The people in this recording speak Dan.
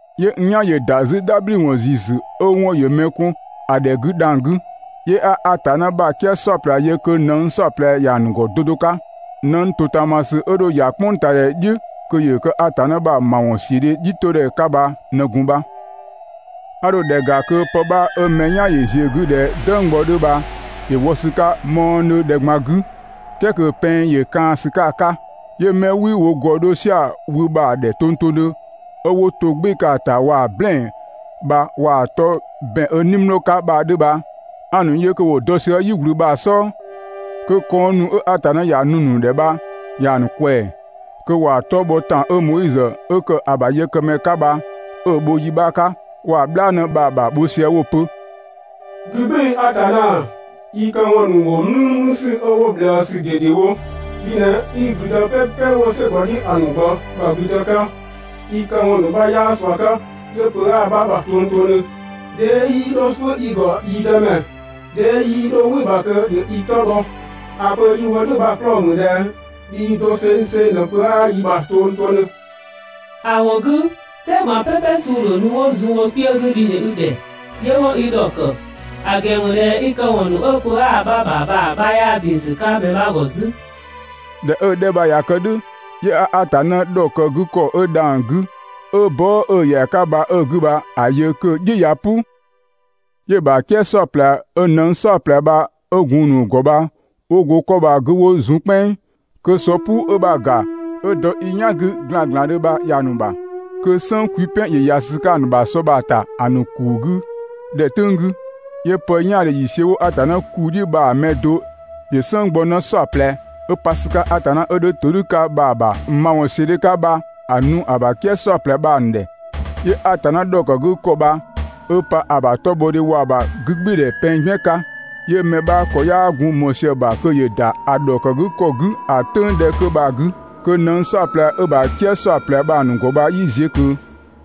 'Yö n "yan ‑yö ‑da 'zü "dhabhliwɔn ‑ziisü 'ö‑ 'wɔn ‑yö mɛ kɔn ‑a ‑dhɛ 'gü dhang‑ 'gü. 'Yö 'a Atanna ‑bha "kië "saɔplɛ yö kö nëng "saɔplɛ ‑ya ‑nu ‑gɔ 'do 'do 'ka. Nëng ‑totaamasü 'ö dho ‑ya "kpʋngtaadhɛ "dhiʋ̈ kö ‑yö kë Atanna ‑bha ‑mawɔnsiödhe "dhiʋ̈todhɛ 'ka bha ꞊në gun bha. 'A dho ‑dhɛ ‑ga kö pë 'bha 'ö mɛ "yan ‑yö ꞊ziö‑ 'gü ꞊dhɛ "dënggbɔ 'dhö bha ‑yö wɔ ‑sü 'ka mü mɔɔdhö ‑dhɛ ꞊gban 'gü, "kɛɛ kö pɛng ‑yö kaan‑ ‑sü 'ka‑ 'ka. 'Yö 'mɛ 'wii wo ‑gɔ 'dho "sia‑ wü bha‑ ‑dhɛ tongtongdhö 'ö 'wo to‑ "gbɩɩ‑ 'ka‑ ‑ta waa‑ "blɛɛn‑ bha waa‑ 'tɔ ‑bɛn 'ö "nimlɔɔ 'ka bha‑ 'dhö bha 'a‑ ‑nu yö kö ‑wo dɔ sië "yi ꞊gblü bha‑ "sɔɔ, kö kɔnng ‑nu 'ö Atanna ‑ya nu‑ ‑nu ‑dhɛ bha ‑ya ‑nu ꞊kwɛɛ‑. Kö ‑wa 'tɔ bhɔ ‑tan 'ö Moizö 'ö ‑kë ‑a ‑bha yëkëmɛ 'ka bha 'ö‑ bho yi 'bha 'ka bha waa‑ "bhlaanë bha‑ ‑bha bho sië 'wo‑ pö: «'Gü "gbɩɩ‑ Atanna, i këwɔn ‑nu ‑wo "mlümlüsü 'ö 'wo ꞊bhlëësü ꞊dedewo. Bhi ꞊në 'i ‑gblüdë "pɛpɛ 'wo "sɛ ‑gɔ "dhiʋ̈, ‑a ‑nu ꞊gban ‑bha ‑gblüdë 'ka, i këwɔn 'bha 'yaa ꞊sua 'ka, 'yö pö 'aa‑ 'bha ‑bha tongtongdhö. 'Dee 'yii 'dho "suʋ̈ i ‑gɔ, yi Dëmɛ? 'Dee 'yii 'dho "wɩ‑ ‑bha kö ‑yö i 'tɔ bhɔ? ‑A pö 'yi‑ wo "dhʋ̈ bha‑ 'klɔɔ‑ ‑mü ꞊dhɛ bhii dosengseng ꞊në pö 'aa i ‑bha tongtongdhö, ‑a ‑wɔn 'gü "sɛ ꞊gban "pɛpɛ suu‑ ‑dho nu 'wo zun wo kpiö 'gü bhi ꞊në i ‑dhɛ 'yö 'wo i ‑dhɔkë, ‑a ‑gɛn ‑mü ꞊dhɛ i këwɔn ‑nu 'ö pö 'aa‑ 'bha ‑bha bha‑ 'bha 'yaa ‑bin ‑sü 'ka mɛ 'bha ‑gɔ 'zü.» ꞊Dhɛ 'ö‑ 'dhɛ bha ꞊ya kë "dhʋ̈, 'yö 'a Atanna ‑dhɔkëgükɔ 'ö dhang‑ 'gü, 'ö bɔɔ" 'ö‑ ‑yɛa 'ka bha 'ö‑ 'gü bha‑ yö kö‑ "dhi ꞊ya "pʋ. 'Yö‑ ‑bha "kië "saɔplɛ 'ö nëng "saɔplɛ bha 'ö gun‑ ‑nu ‑gɔ bha 'wo go 'kɔ bha‑ 'gü 'wo zun "kpɛnng, kö sɔ "puu 'ö 'bha‑ ‑ga 'ö dɔ i "yan 'gü ‑glanglandhö bha ‑ya ‑nu ‑bha, kö "sënng kwipɛn ‑yö ‑ya ‑sü 'ka‑ ‑nu ‑bha sɔ bha‑ ‑ta ‑a ‑nu ‑kuu 'gü ‑dhɛ "tʋ̈ng 'gü. 'Yö pë "yaandhe ‑yiisiö 'wo Atanna ‑kuu "dhiʋ̈ bha‑ mɛ do ‑yö "sënnggbɔnë "saɔplɛ, 'ö pa ‑sü 'ka Atanna 'ö 'dhö ‑todhʋ̈ 'ka bha‑ ‑bha ‑mawɔnsiödhe 'ka bha‑ nu ‑a ‑bha "kië "saɔplɛ bha‑ ‑nu ‑dhɛ. 'Yö Atanna ‑dhɔkëgükɔ bha 'ö pa ‑a ‑bha 'tɔbhɔdhe waa‑ ‑bha 'gügbɩɩdhɛ pɛng "gbiën 'ka, 'yö mɛ 'bha 'kɔ 'yaa gun ꞊mɔɔ sië‑ ‑bha kö ‑yö ‑da ‑a ‑dhɔkëgükɔ 'gü ‑a "tʋ̈ng 'dhɛ 'kö bha‑ 'gü kö nëng "saɔplɛ 'ö‑ ‑bha "kië "saɔplɛ bha‑ ‑nu ‑gɔ bha 'yii ziö ꞊kö.